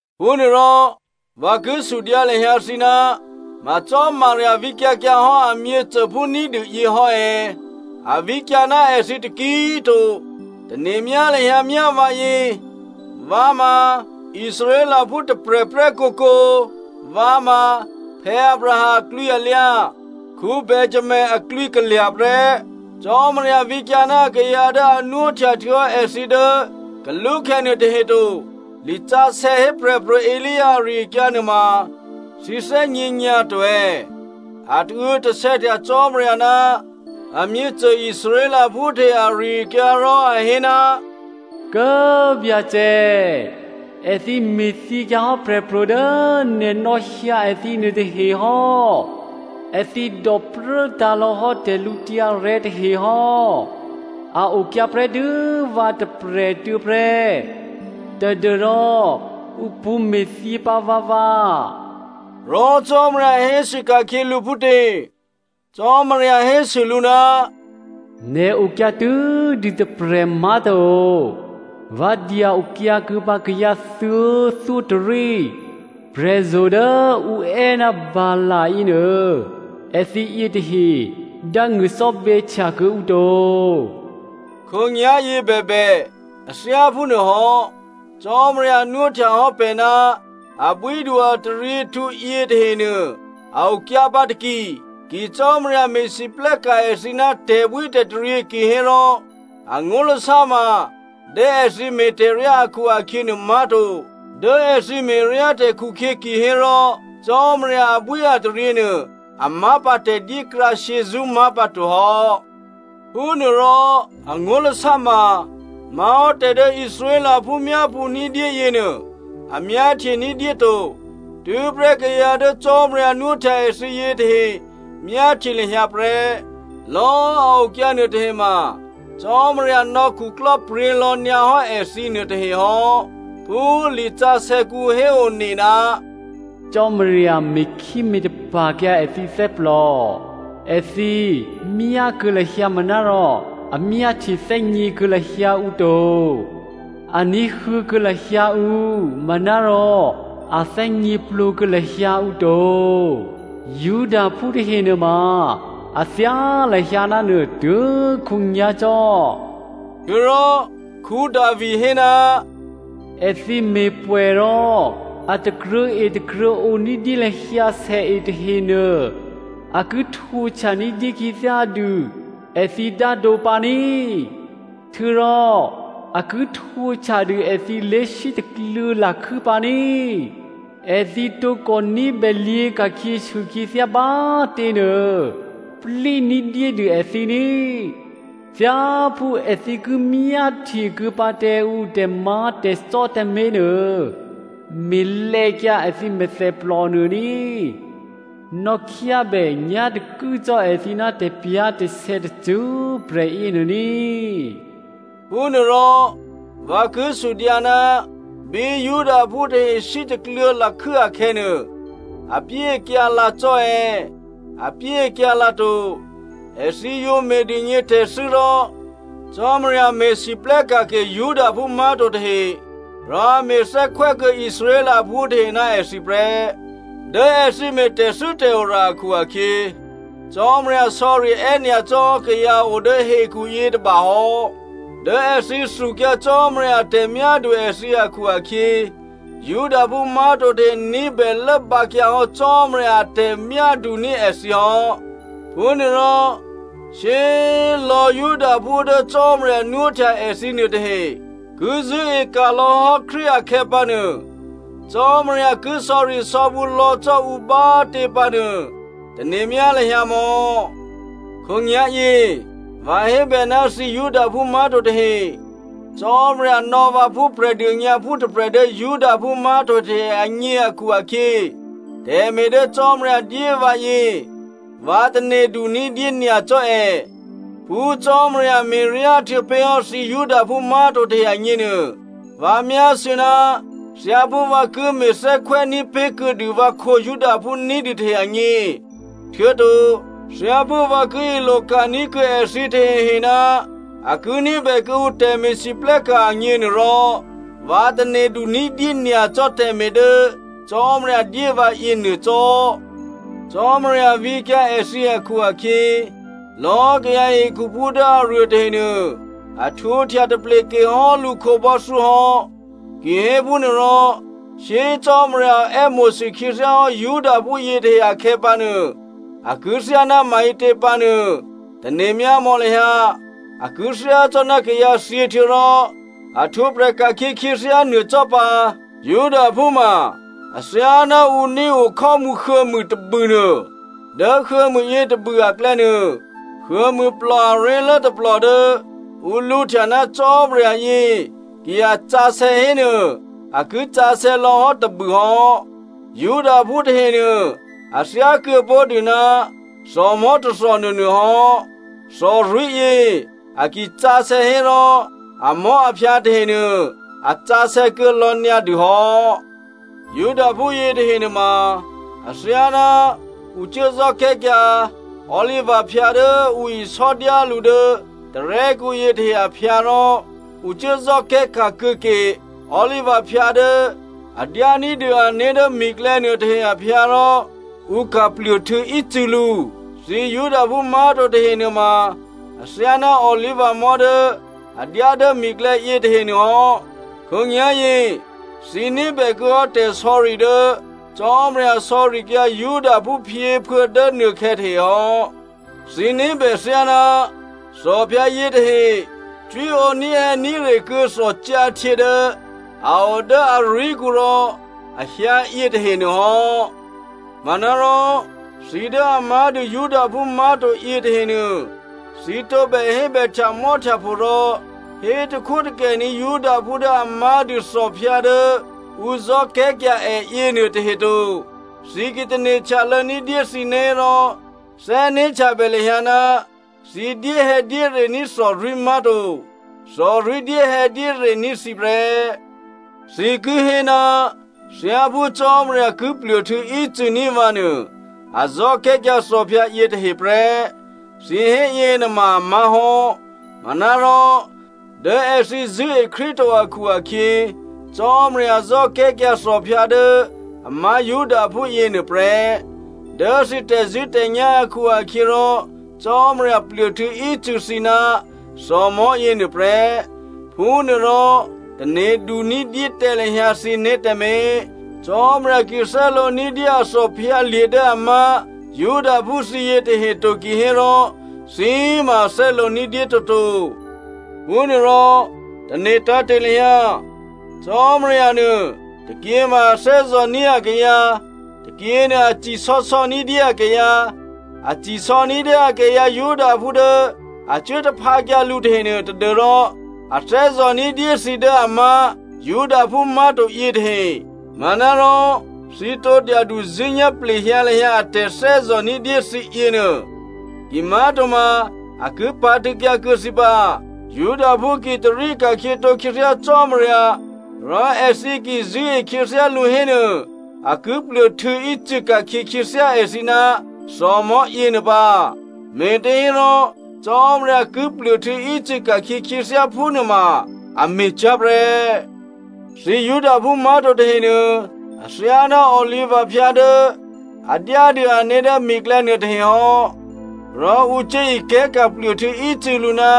Phúnuôrò vǎ ki sudyǎ lahyǎ thǐ, ma Cò́marya vǐkyǎ kyǎ hò́ a myěcôphú ní̤dû yě hò́ è̌? A vǐkyǎ ná èthǐ taki꤮ to. Tane̤myá lahyǎ myá vǎyě, vǎ ma꤮ Israelphú tôprè̤prè́ kǒkǒ. Vǎ ma Abraham aklwǐalyǎ, Benjamino aklwǐ kalya̤ prè́. Cò́marya vǐkyǎ ná akayǎ dố a nwóhtya htuô̌hò́ èthǐ dố kalúkhè̌ nuôtahe to. Lisǎsè̌ hé Prè̤pro̤ Elia ari-akyǎ nuôma thǐ thè́gně nyǎ to è̌? A tauô̌tasè̌htya Cò́marya ná amyěcô Israelphú tahe ari-akyǎ rò a hé, “Kố꤮ Byacè꤮, èthǐ me̤thyěkyǎ hò́ prè̤pro̤ dố nè̤ nò̌hyǎ èthǐ nuôtahe hò́. Èthǐ dòpruố tǎ̤lò̌ hò́ tè̤lǔtyǎrè̤́ tahe hò́. A okyǎ prè́tû́ vǎ tôprè̤꤮ tuô̌ prè́, tadû́rò ǔ pṳ̌me̤thyěpǎ vǎvǎ.” Rò Cò́marya hésû ka̤khyě lǔ phútě? Cò́marya hésû lǔ, “Nè̤ okyǎ tû́dû tôprè̤ má̤to, vǎ dya-okyǎ kuô̌pǎ kayǎ thuô̌thyótôrí. Prè̤zo̤ dố ǔ è́ ná Baal yěnuô, èthǐ yětahe dángṳ̂ cò́bè̌htya kuô̌ǔ to.” Khǒnyá̤yě bèbè a thyá phúnuôhò́, Cò́marya nwóhtya hò́ pè̤ ná abwídu-ataryěhtǔ yětahenuô, a okyǎpǎ taki. Ki Cò́marya me̤lwóhteka̤ èthǐ ná tè̤bwítè̤taryě kihérò, angó̤lasá ma dố èthǐ me̤ tè̤ryá akhu-akhyě nuômá̤to. Dố èthǐ me̤ryátè̤ khukhyě kihérò Cò́marya abwíataryě nuô, a má̤ pǎ tè̤dyékrǎ shyězṳ́ má̤pǎto hò́. Phúnuôrò, angó̤lasá ma má̤hò́ tè̤ dố Israelphú myápṳ̌ ní̤dyé yěnuô, a myáhtye ní̤dyé to. Tû́prè́ kayǎ dố Cò́marya nwóhtya èthǐ yětahe myáhtye lahyǎ prè́. Lò̌꤮ a okyǎ nuôtahe ma Cò́marya nò̌ khuklò́pryě̤ lò̌ nyǎhò́ èthǐ nuôtahe hò́. Phú lisǎsè̌kǔ héone, “Cò́marya me̤khíme̤tapa̤kyǎ èthǐ thè́plò. Èthǐ myákuô̌ lahyǎ manárò a myáhtye thè́gně kuô̌ lahyǎ ǔ to. A ní̤huô̌kuô̌ lahyǎ ǔ manárò a thè́gněplǒ kuô̌ lahyǎ ǔ to. Judaphú tahe nuôma a thyá lahyǎ ná nuô tuố̤khǒnyá̤cò́.” Htuô̌rò Davi hé, “Èthǐ me̤ pwè̌ rò a takruô̤̌e takruô̤̌ǒ ní̤dyé lahyǎ sèe tahenuô, a ki htwǒhtya ní̤dyé khyěthyá dû èthǐ dádǒ pǎ ní꤮. Htuô̌rò a ki htwǒhtyadû èthǐ lé̤sítakluô̌ lakhû́ pǎ ní꤮. Èthǐ tǒkò ní̤bè lyě̤ ka̤khyěsû khyěthyá bá꤮ těnuô, plí ní̤dyédû èthǐ ní꤮. Thyáphú èthǐ ki myáhtyekuô̌ pǎ tǎ ǔ tè̤má̤tè̤cò́ tǎmé̤nuô, me̤lè̌kyǎ èthǐ mèthèplò nuô ní꤮. Nò̌khyábè nyá̤takû́cò́ èthǐ ná tè̤pyá̤tè̤sè̌ tacṳ́prè̤ yěnuô ní꤮.” Phúnuôrò vǎ ki sudyǎ, bí Judaphú tahe sítakluô̌ lakhû́ akhè̌nuô, apyéakyǎ lǎ cò́ è̌? Apyéakyǎ lǎto. Èthǐ yǒ me̤dûgně tè̤thû́ rò, Cò́marya me̤lwóhteka̤ ke Judaphú má̤to tahe, rò a me̤ thè́khwè́kuô̌ Israelphú tahe ná èthǐ prè́. Dố èthǐ me̤ tè̤thû́tè̤ora akhu-akhyě, Cò́marya sò̌ri è́nyacò́ hò́ kayǎ o dố hekhu yětôba hò́. Dố èthǐ thukyǎ Cò́marya a tè̤myádu èthǐ akhu-akhyě, Judaphú má̤to tahe ní̤bè lốbǎkyǎ hò́ Cò́marya a tè̤myáduní̤ èthǐ hò́. Phúnuôrò shyé꤮ lò̌꤮ Judaphú dố Cò́marya nwóhtya èthǐ nuôtahe ki zṳ̂́eka̤ lò̌hò́ Krístu akhè̌ pǎnuô, Cò́marya ki sò̌risò̌bǔ lò̌ cò́ ǔ bá꤮ tě pǎnuô, tane̤myá lahyǎ mò̌. Khǒnyá̤yě, vǎ hébè ná thǐ Judaphú má̤to tahe. Cò́marya nò̌ vǎ phú Prè̤dônyǎphú tôprè̤ dố Judaphú má̤to tahe agně akhu-akhyě, tè̤me̤ dố Cò́marya dyé vǎ yě vǎ tane̤du ní̤dyé nyacò́ è. Phú Cò́marya me̤ryá htuô̌pé̤hò́ thǐ Judaphú má̤to tahe agněnuô, vǎ myásû̌ ná thyáphú vǎ ki me̤ thè́khwè́ ní̤pé̤ kuô̌dû vǎkhǒ Judaphú ní̤dû tahe agně, htuô̌to thyáphú vǎ ki iloka̤ní̤ kuô̌ èthǐ tahehe ná a ki ní̤bè kuô̌ǔ tè̤me̤lwóhteka̤ agněnuôrò, vǎ tane̤du ní̤dyé nyacò́ tè̤me̤ dố Cò́marya dyé vǎ yěnuô cò́. Cò́marya vǐkyǎ èthǐ akhu-akhyě, lò̌꤮ kayǎ hekhuphú dố aruô tahenuô a htwǒhtya tapleke hò́ lǔ khǒbò́thyó hò́. Kihéphúnuô rò shyé꤮ Cò́marya è́mo̤sû khyěthyá hò́ Judaphú yětahe akhè̌pǎnuô a ki thyáná maǐtě pǎnuô tane̤myámò̌ lahyǎ. A ki thyácò́ná kayǎthyě htuô̌rò a htwǒprè̤ ka̤khyě khyěthyá nuô cò́ pǎ. Judaphú ma athyáná ǔ nío khò́mǔ huô̌mû tôbûnuô. Dố huô̌mû yětôbû aklè̌nuô, huô̌mûplò aré̤lố tôplò dố ǔ lǔhtya ná Cò́marya yě ki a sǎsè̌ hénuô, a ki sǎsè̌ lò̌hò́ tôbûhò́. Judaphú tahenuô a thyákuô̌ pó̤dû ná thòmò̤́ tôthò nuônuôhò́. Thòrwí̤yě a ki sǎsè̌ hérò amò̤́aphyǎ tahenuô a sǎsè̌ kuô̌ lò̌ nyǎ dû hò́. Judaphú yětahe nuôma athyáná ǔ cuố zò́kè̤́kyǎ olivaphyǎ dố ǔ isò́dyá lǔ dố tarè́kǔ yětahe aphyǎ rò ǔ cuố zò́kè̤́ka̤ kuô̌ke olivaphyǎ dố a dyání̤dû ané̤ dố mi̤klè̌ nuôtahe aphyǎ rò ǔ ka̤ pluôhtû̌ ícû̌lǔ. Thǐ Judaphú má̤to tahe nuôma athyáná olivamò̤́ dố a dyá dố mi̤klè̌ yětahe nuôhò́. Khǒnyá̤yě thǐ ní̤bè kuô̌hò́ tè̤sò̌ri dố Cò́marya sò̌rikyǎ Judaphú phyěphuô̌ dố nuôkhè̌ tahe hò́. Thǐ ní̤bè thyáná thòphyǎ yětahe cwíǒ ní̤hè̌ní̤re kuô̌ thòcyǎhtyě dố a o dố arwí̤kǔ rò a hyǎ yětahe nuôhò́. Manárò thǐ dố a má̤dû Judaphú má̤to yětahenuô, thǐ tǒbè hébè htyamò́htyapho rò hétakhwótakè ní̤ Judaphú dố a má̤dû thòphyǎ dố ǔ zò́kè̤́kyǎ è yěnuôtahe to. Thǐ ki tane̤ htyalô̌ ní̤dyé thǐné̤ hérò, thè́né̤htyabè lahyǎ, thǐ dyéhè̌dyére ní̤ thòrwí̤ má̤to. Thòrwí̤ dyéhè̌dyére ní̤ thǐ prè́. Thǐ ki hé, “Thyáphú Cò́marya ki pluôhtû̌ ícû̌ ní̤ vǎnuô, a zò́kè̤́kyǎ thòphyǎ yětahe prè́.” Thǐ hé yěnuôma a má̤hò́. Manárò dố èthǐ zṳ̂́e Krístu to akhu-akhyě, Cò́marya zò́kè̤́kyǎ thòphyǎ dố a má̤ Judaphú yěnuô prè́. Dố thǐ tè̤zṳ̂́tè̤nyá̤ akhu-akhyěrò, Cò́marya pluôhtû̌ ícû̌ thǐ ná thòmò̤́ yěnuô prè́. Phúnuôrò tane̤du ní̤dyé tǎ lahyǎ thǐné̤ tǎmé̤. Cò́marya ki thè́lǒ ní̤dyé a thòphyǎlye̤ dố a má̤ Judaphú thǐ yětahe to kihérò thǐ ma꤮ a thè́lǒ ní̤dyé toto. Phúnuôrò tane̤ tǎ̤te̤ lahyǎ. Cò́marya nuô, tôkyěma a thè́zò̤ní̤ akayǎ, tôkyě nuô a ci sò̌sò̌ ní̤dyé akayǎ. A cisò̌ ní̤dyé akayǎ Judaphú dố a cuố taphǎkyǎ lǔ tahenuô tadû́rò a thè́zò̤ ní̤dyé thǐ dố a má̤ Judaphú má̤to yětahe. Manárò thǐ tǒ dyaduzṳ̂́nyá̤ plehyǎ lahyǎ a tè̤thè́zò̤ ní̤dyé thǐ yěnuô. Kimá̤toma a ki pǎ̤tṳ̂̌kyǎ kuô̌ thǐ pǎ. Judaphú ki tarí ka̤khyětǒ khyěthyá Cò́marya, rò èthǐ ki zṳ̂́e khyěthyá lǔ hénuô, a ki pluôhtû̌ ícû̌ ka̤khyě khyěthyá èthǐ ná thòmò̤́ yěnuô pǎ, me̤těhérò Cò́marya ki pluôhtû̌ ícû̌ ka̤khyě khyěthyá phúnuô ma a me̤ cyá̤prè́. Thǐ Judaphú má̤to tahenuô athyáná olivaphyǎ dố a dyádû ané̤ dố mi̤klè̌ nuôtahe hò́, rò ǔ cuố ikè̤́ka̤ pluôhtû̌ ícû̌lǔ ná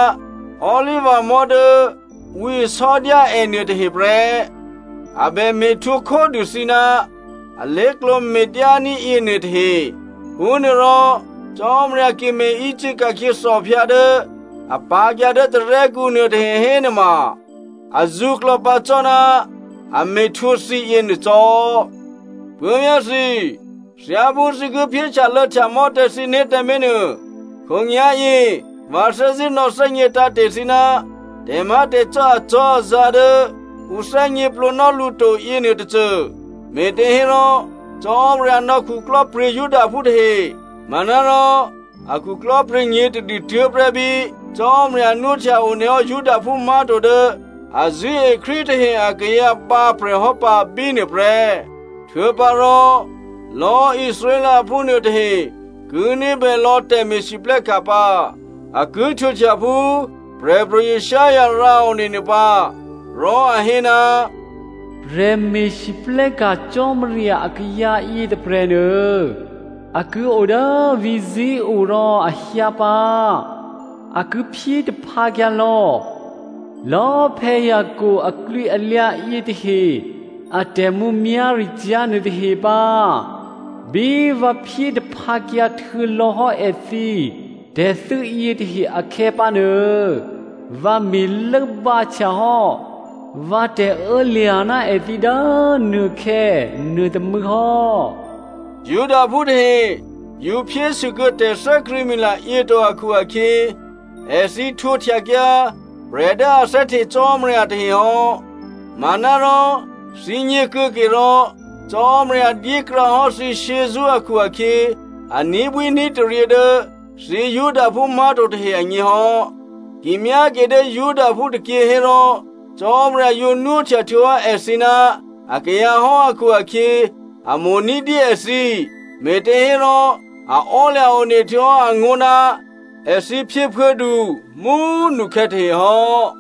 olivamò̤́ dố ǔ isò́dyá è nuôtahe prè́. A bè me̤htwǒ khódû thǐ ná alé̤klǒ me̤dyání̤ yěnuôtahe. Phúnuôrò Cò́marya ki me̤ícû̌ ka̤khyě thòphyǎ dố a pǎ̤kyǎ dố tarè́kǔ nuôtahe hénuôma azǔklò̌ pǎ cò́ ná a me̤htwǒ thǐ yěnuô cò́. Puố̤vyá̤ thǐ꤮, thyáphú thǐ ki phyé htyalô̌htyamò́ tǎ thǐné̤ tǎmé̤ nuô, khǒnyá̤yě vǎ thè́zṳ̂́ nò̌thè́gně tǎ̤te̤ thǐ ná tè̤má̤tè̤cò́ acò́azǎ̤ dố ǔ thè́gněplǒnò́ lǔ to yěnuôtôcô, me̤těhérò, Cò́marya nò̌ khuklò́pryě̤ Judaphú tahe. Manárò a khuklò́pryě̤ nyě̤tadû tuố̤prè́ bí Cò́marya nwóhtya onehò́ Judaphú má̤to dố a zṳ̂́e Krístu tahe akayǎ bǎprè̤ hò́ pǎ bínuô prè́. Htuô̌pǎrò, lò̌꤮ Israelphú nuôtahe ki ní̤bè lò̌ tè̤me̤lwóhteka̤ pǎ. A ki htwǒhtya phú Prè̤pro̤ Isaiah rǎone nuô pǎ. Rò a hé, “Prè̤ me̤lwóhteka̤ Cò́marya akayǎ yětôprè̤nuô a ki o dố vǐ̤ Zion rò a hyǎ pǎ. A ki phyé taphǎkyǎ lò̌lò̌꤮ Jacob aklwǐalyǎ yětahe a tè̤mǔmyá̤ricyá̤ nuôtahe pǎ. Bí vǎ phyé taphǎkyǎ htuô̌lò̌hò́ èthǐ tè̤thû́ yětahe akhè̌pǎnuô, vǎ me̤ lốbǎhtya hò́ vǎ tè̤ô̌lya̤ ná èthǐ dố nuôkhè̌ nuôtômû̌ hò́.” Judaphú tahe yǒ phyésûkuô̌ tè̤thè́krṳ̂̌mila yě to akhu-akhyě, èthǐ htwǒhtyakyǎ prè̤ dố a thè́hte Cò́marya tahe hò́. Manárò thǐgně kuô̌ke rò Cò́marya dyékrǎ hò́ thǐ shyězṳ́ akhu-akhyě a ní̤bwíní̤taryě dố thǐ Judaphú má̤to tahe agně hò́. Ki myáke dố Judaphú tôkyě hérò Cò́marya yǒ nwóhtya htuô̌hò́ èthǐ ná akayǎ hò́ akhu-akhyě, a mo̤ ní̤dyé èthǐ, me̤těhérò a ò́lya̤ one htuô̌hò́ angó̤ ná èthǐ phyěphuô̌du mú꤮ nukhè̌ tahe hò́.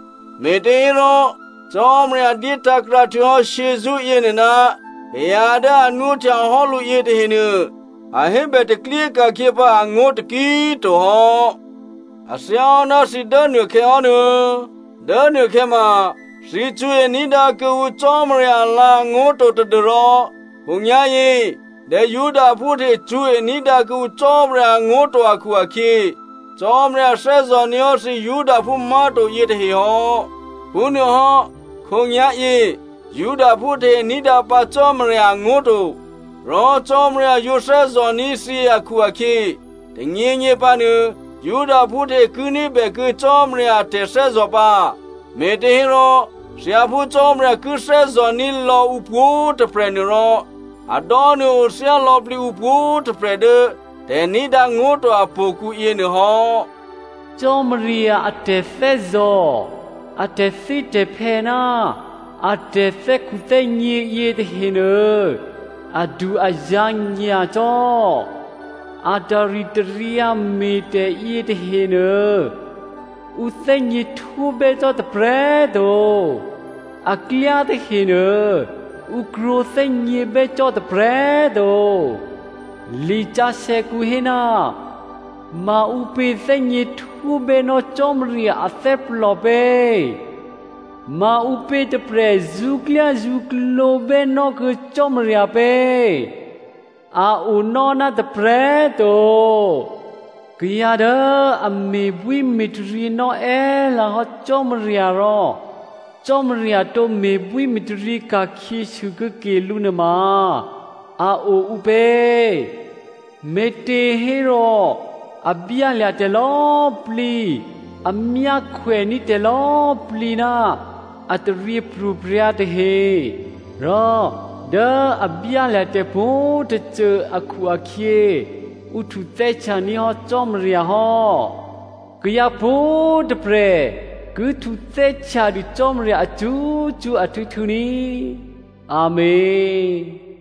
Me̤těhérò Cò́marya dyétǎ̤krǎ htuô̌hò́ shyězṳ́ yěnuô ná kayǎ dố a nwóhtya hò́ lǔ yětahenuô, a hébè taklyé ka̤khyě pǎ angó̤ taki꤮ to hò́. A thyáhò́ ná thǐ dố nuôkhè̌ hò́ nuô̌, dố nuôkhè̌ ma thǐ cṳ̌e ní̤dǎ kuô̌ǔ Cò́marya alǎ̤angó̤ to tadû́rò khǒnyá̤yě dố Judaphú tahe cṳ̌e ní̤dǎ kuô̌ǔ Cò́marya angó̤ to akhu-akhyě Cò́marya thè́zò̤ní̤ hò́ thǐ Judaphú má̤to yětahe hò́. Phúnuôhò́, khǒnyá̤yě Judaphú tahe ní̤dǎ pǎ Cò́marya angó̤ to. Rò Cò́marya yǒ thè́zò̤ní̤ thǐ akhu-akhyě, tônyěnyě pǎnuô Judaphú tahe ki ní̤bèkuô̌ Cò́marya a tè̤thè́zò̤ pǎ. Me̤těhérò thyáphú Cò́marya ki thè́zò̤ní̤ lò̌ǔ pwǒ̤꤮ tôprè̤ nuôrò, a dò́nuô̌ othyá lò̌plǐ ǔ pwǒ̤꤮ tôprè̤ dố tè̤ní̤dǎ ngó̤ to apo̤kǔ yěnuô hò́. Cò́marya a tè̤thè́zò̤, a tè̤thítè̤phè́ ná a tè̤thè́khuthè́gně yětahenuô, adu-azǎ̤ nyacò́. A taritaryǎ me̤tè̤ yětahenuô, ǔ thè́gněhtwó bè́ cò́ tôprè̤꤮ to. Aklyá tahenuô ǔ krwǒ thè́gně bè́ cò́ tôprè̤꤮ to. Lisǎsè̌kǔ hé, “Maǔpě thè́gněhtwó bè́nò́ Cò́marya athè́plò pě? Maǔpě tôprè̤ zṳ̌klyázṳ̌klǒ bè́nò́kuô̌ Cò́marya pě? A onò́ ná tôprè̤꤮ to.” “Kayǎ dố a me̤bwíme̤taryě nò́ è́lǎ hò́ Cò́marya rò Cò́marya tǒ me̤bwíme̤taryě ka̤khyěsû kuô̌ke lǔ nuôma a o ǔpě?” Me̤těhérò, a byálya̤ tè̤lò̌꤮ plǐ, a myákhwèní̤ tè̤lò̌꤮ plǐ ná a taryěpro̤prya̤ tahe, rò dố a byálya̤ tè̤pwǒ̤꤮ tôcô akhu-akhyě ǔ htuthè́htyaní̤ hò́ Cò́marya hò́. Kayǎ pwǒ̤꤮ tôprè̤ ki htuthè́htyadû Cò́marya acṳ́cṳ́ ahtû̌htû̌ ní꤮. Amèn.